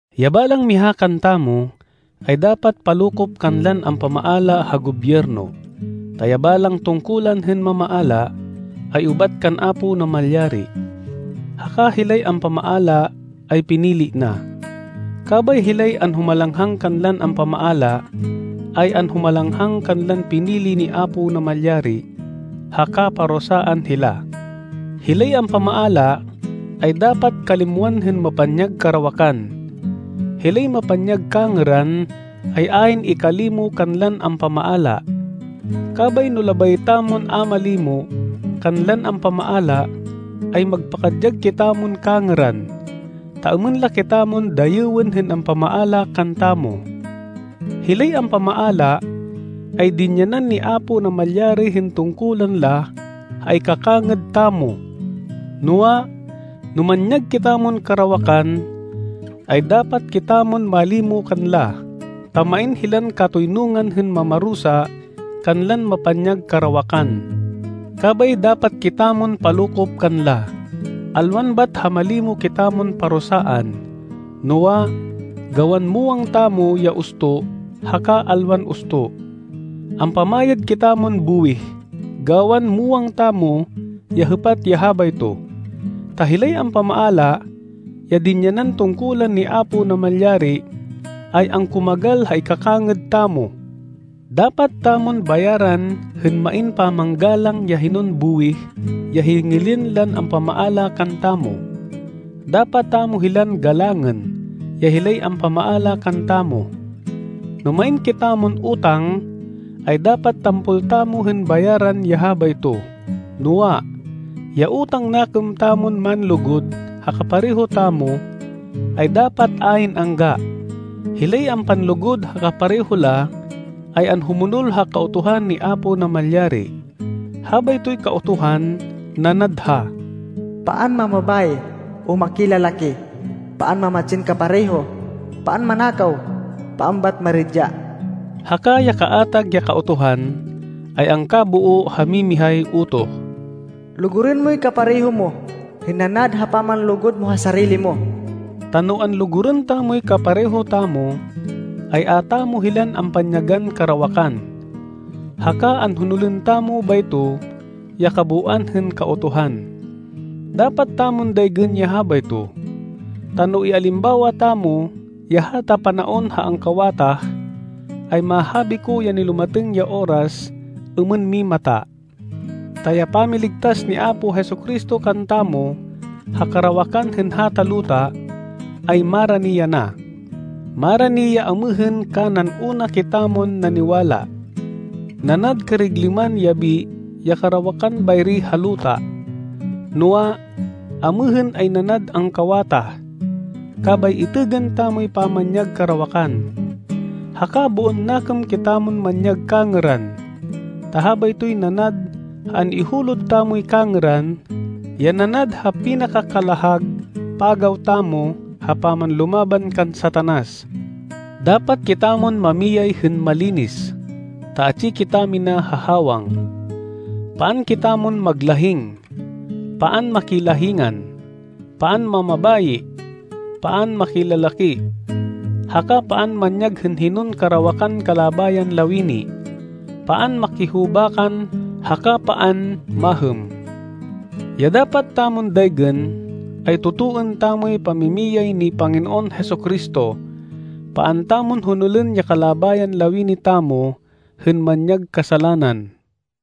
Ya balang miha kantamo ay dapat palokop kanlan ampamaala ha gobyerno, ta ya balang tungkulan hên mamaala ay ubat kan Apo Namalyari, haka hilay ampamaala ay pinili na. Kabay hilay anhumalanghang kanlan ampamaala, ay anhumalanghang kanlan pinili ni Apo Namalyari, haka parusaan hila. Hilay ampamaala ay dapat kalimwan hên mapanyag karawakan. Hilay mapanyag kangêran ay ayn ikalimo kanlan ampamaala. Kabay no labay tamon a malimo kanlan ampamaala, ay magpakadyag kitamon kangêran, ta êmên la kitamon dayêwên hên ampamaala kantamo. Hilay ampamaala ay dinyanan ni Apo Namalyari hên tungkulan la ha ikakangêd tamo. Noa, no manyag kitamon karawakan, ay dapat kitamon malimo kanla, ta main hilan katoynungan hên mamarusa kanlan mapanyag karawakan. Kabay dapat kitamon palokop kanla, alwan bat ha malimo kitamon parusaan, noa, gawan muwang tamo ya usto haka alwan usto. Ampamayad kitamon buwih gawan muwang tamo ya hêpat ya habayto, ta hilay ampamaala, ya dinyanan tungkulan ni Apo Namalyari, ay angkumagal ha ikakangêd tamo. Dapat tamon bayaran hên main pamanggalang ya hinon buwih ya hingilên lan ampamaala kantamo. Dapat tamo hilan galangên ya hilay ampamaala kantamo. No main kitamon utang, ay dapat tampol tamo hên bayaran ya habayto. Noa, ya utang nakêm tamon manlugud ha kapareho tamo, ay dapat ayn angga. Hilay ampanlugud ha kapareho la ay anhumonol ha Kautuhan ni Apo Namalyari. Habaytoy Kautuhan, nanad ha, “Paan mamabayi o makilalaki, paan mamatsin kapareho, paan manakaw, paan bat maridya,” haka ya kaatag ya Kautuhan, ay angkaboo ha mimihay utoh, “Lugurên moy kapareho mo hên nanad ha pamanlugud mo ha sarili mo.” Ta no anlugurên tamoy kapareho tamo, ay a tamo hilan ampanyagan karawakan, haka anhonolên tamo bayto ya kabooan hên Kautuhan. Dapat tamon daygên ya habayto, ta no ialimbawa tamo ya hata panaon ha angkawatah, ay mahabi ko ya nilumatêng ya oras êmên mimata, ta ya pamiligtas ni Apo Jesu-Cristo kantamo ha karawakan hên hata luta, ay marani yana. Marani ya amêhên kanan una kitamon naniwala. Nanad kariglêman yabi ya karawakan bayri ha luta, noa, amêhên ay nanad angkawatah. Kabay itêgên tamoy pamanyag karawakan, haka boon nakêm kitamon manyag kangêran, ta habaytoy nanad ha an-ihulod tamoy kangêran, ya nanad ha pinaka-kalahag pagaw tamo ha pamanlumaban kan Satanas. Dapat kitamon mamiyay hên malinis, ta atsi kitamina ha hawang. Paan kitamon maglahing, paan makilahingan, paan mamabayi, paan makilalaki, haka paan manyag hên hinon karawakan kalabayan lawini, paan makihubakan haka paan mahêm. Ya dapat tamon daygên ay totoên tamoy pamimiyay ni Panginoon Jesu-Cristo, paan tamon honolên ya kalabayan lawini tamo hên manyag kasalanan.